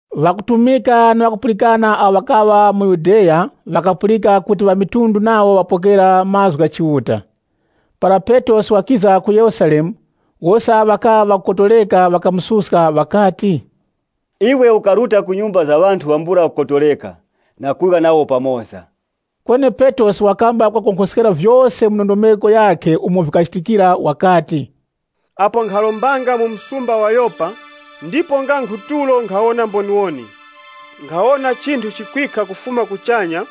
Ŵakutumika na ŵakupulikana awo ŵakaŵa mu Yudeya, ŵakapulika kuti ŵamitundu nawo ŵapokera mazgu gha Chiuta. Para Petrosi wakiza ku Yerusalemu, wose awo ŵakaŵa ŵakukotoreka ŵakamususka ŵakati, “Iwe ukaruta ku nyumba za ŵanthu ŵambula kukotoreka na kurya nawo pamoza!” Kweni Petrosi wakamba kuŵakonkhoskera vyose mu ndondomeko yakhe umo vikachitikira wakati, “Apo nkharombanga mu msumba wa Yopa, ndipo nga nkhu tulo nkhawona mboniwoni. Nkhawona chinthu chikwikha kufuma kuchanya,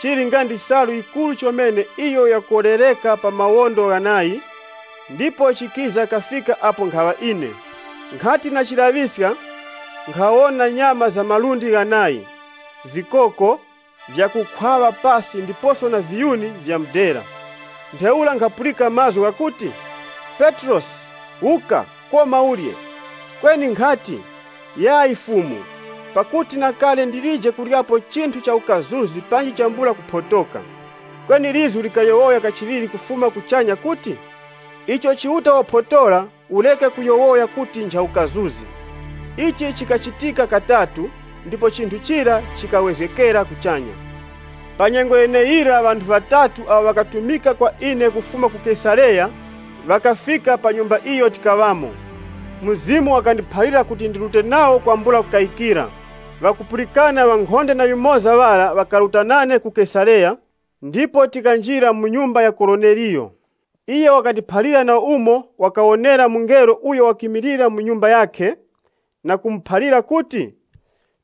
chili nga ndi chisalu chikuru chomene icho chakolereka pa mawondo ghanayi, ndipo chikiza kafika apo nkhaŵa ine. Nkhati ndachilaŵisiska, nkhawona nyama za malundi ghanayi, vikoko, vyakukhwaŵa pasi ndiposo na viyuni vya mudera. Ntheura nkhapulika mazgu ghakuti, ‘Petrosi, wuka, koma urye.’ Kweni nkhati, ‘Yayi Fumu! Pakuti na kale ndilije kuryapo chinthu cha ukazuzi panji chambula kuphotoka.’ Kweni lizgu likayowoya kachiŵiri kufuma kuchanya kuti, ‘Icho Chiuta waphotora, ureke kuyowoya kuti ncha ukazuzi.’ Ichi chikachitika katatu, ndipo chinthu chira chikawezgekera kuchanya. Pa nyengo yeneyirayira ŵanthu ŵatatu awo ŵakatumika kwa ine kufuma ku Kesareya, ŵakafika pa nyumba iyo tikaŵamo. Mzimu wakandiphalira kuti ndirute nawo kwambula kukayikira. Ŵakupulikana ŵankhonde na yumoza ŵara ŵakaruta nane ku Kesareya, ndipo tikanjira mu nyumba ya Koroneliyo. Iyo wakatiphalira na umo wakawonera mungelo uyo wakimilira mu nyumba yakhe, na kumuphalira kuti,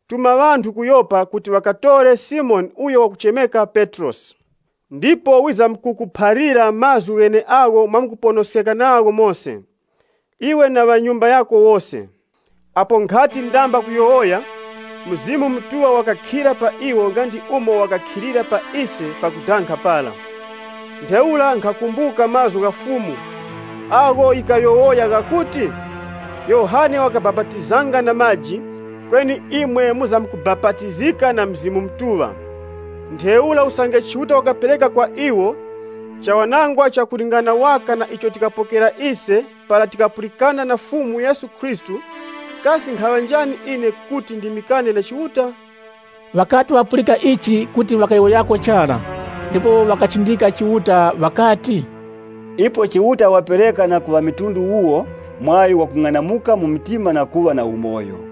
‘Tuma ŵanthu ku Yopa kuti ŵakatore Simoni uyo wakuchemeka Petrosi. Ndipo wizamkukuphalira mazgu gheneagho mwamuponoskeka nagho mose, iwe na ŵa nyumba yako wose.’ Apo nkhati ndamba kuyowoya, Mzimu Mutuŵa wakakhira pa iwo nga ndi umo wakakhilira pa ise pakudanga para. Ntheura nkhakumbuka mazgu gha Fumu, agho yikayowoya ghakuti, ‘Yohane wakabapatizanga na maji, kweni imwe mwizamkubapatizika na Mzimu Mutuŵa.’ Ntheura usange Chiuta wakapereka kwa iwo chawanangwa cha kulingana waka na icho tikapokera ise para tikapulikana na Fumu Yesu Khristu, kasi nkhaŵa njani ine kuti ndimikane na Chiuta?” Ŵakati ŵapulika ichi, kuti ŵakayowoyako chara. Ndipo ŵakachindika Chiuta ŵakati, “Ipo Chiuta wapereka na ku ŵamitundu wuwo mwaŵi wa kung'anamuka mu mtima na kuŵa na umoyo.”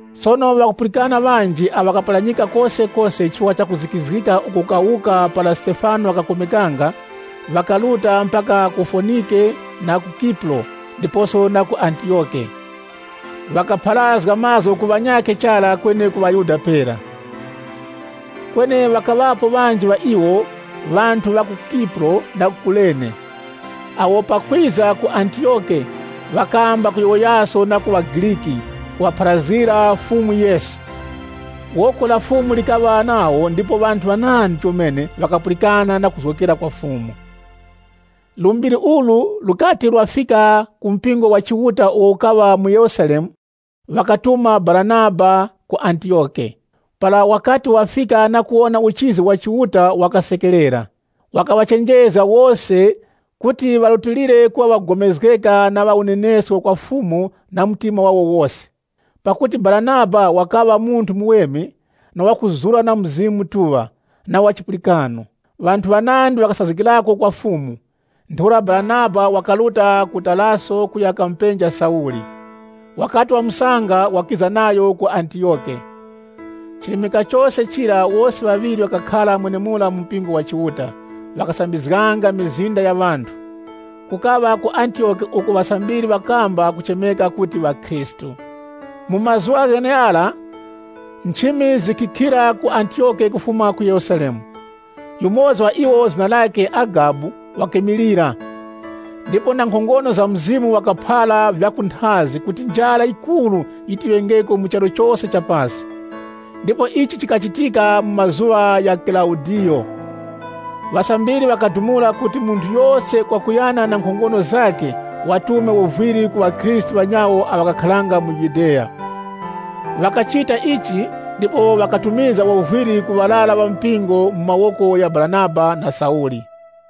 Sono ŵakupulikana ŵanji awo ŵakaparanyikira kosekose chifukwa cha kuzikizgika uko kukawuka para Stefano wakakomekanga, ŵakaruta mpaka ku Fonike na ku Kipuro ndiposo na ku Antiyoke. Ŵakapharazga mazgu ku ŵanyakhe chara kweni ku ŵaYuda pera. Kweni ŵakaŵapo ŵanji ŵa iwo, ŵanthu ŵa ku Kipuro na Kurene, awo pakwiza ku Antiyoke, ŵakamba kuyowoyaso na ku ŵaGriki, kuŵapharazgira Fumu Yesu. Woko la Fumu likaŵa nawo ndipo ŵanthu ŵanandi chomene ŵakapulikana na kuzgokera kwa Fumu. Lumbiri ulu lukati lwafika ku mpingo wa Chiuta uwo ukaŵa mu Yerusalemu, ŵakatuma Baranaba ku Antiyoke. Para wakati wafika na kuwona uchizi wa Chiuta wakasekerera. Wakaŵachenjezga wose kuti ŵarutilire kuŵa ŵakugomezgeka na ŵa unenesko kwa Fumu na mtima wawo wose. Pakuti Baranaba wakaŵa munthu muweme, na wakuzura na Mzimu Mutuŵa, na wa chipulikano. Ŵanthu ŵanandi ŵakasazgikirako kwa Fumu. Ntheura Baranaba wakaruta ku Taraso kuya kamupenja Sauli Wakati wamusanga wakiza nayo ku Antiyoke. Chirimika chose chira, wose ŵaŵiri ŵakakhara mwenemura mu mpingo wa Chiuta, ŵakasambizganga mizinda ya ŵanthu. Kukaŵa ku Antiyoke uko ŵasambiri ŵakamba kuchemeka kuti ŵakhristu. Mu mazuŵa gheneghara, nchimi zikikhira ku Antiyoke kufuma ku Yerusalemu. Yumoza wa iwo zina lakhe Agabu wakimilira, ndipo na nkhongono za Mzimu wakaphara vya kunthazi kuti njara yikuru yiti yiŵengeko mu charu chose cha pasi. (Ndipo ichi chikachitika mu mazuŵa gha Kilaudiyo.) Ŵasambiri ŵakadumula kuti munthu yose kwakuyana na nkhongono zakhe watume wovwiri ku ŵakhristu ŵanyawo awo ŵakakharanga mu Yudeya. Ŵakachita ichi, ndipo ŵakatumizga wovwiri ku ŵarara ŵa mpingo mu mawoko gha Baranaba na Sauli.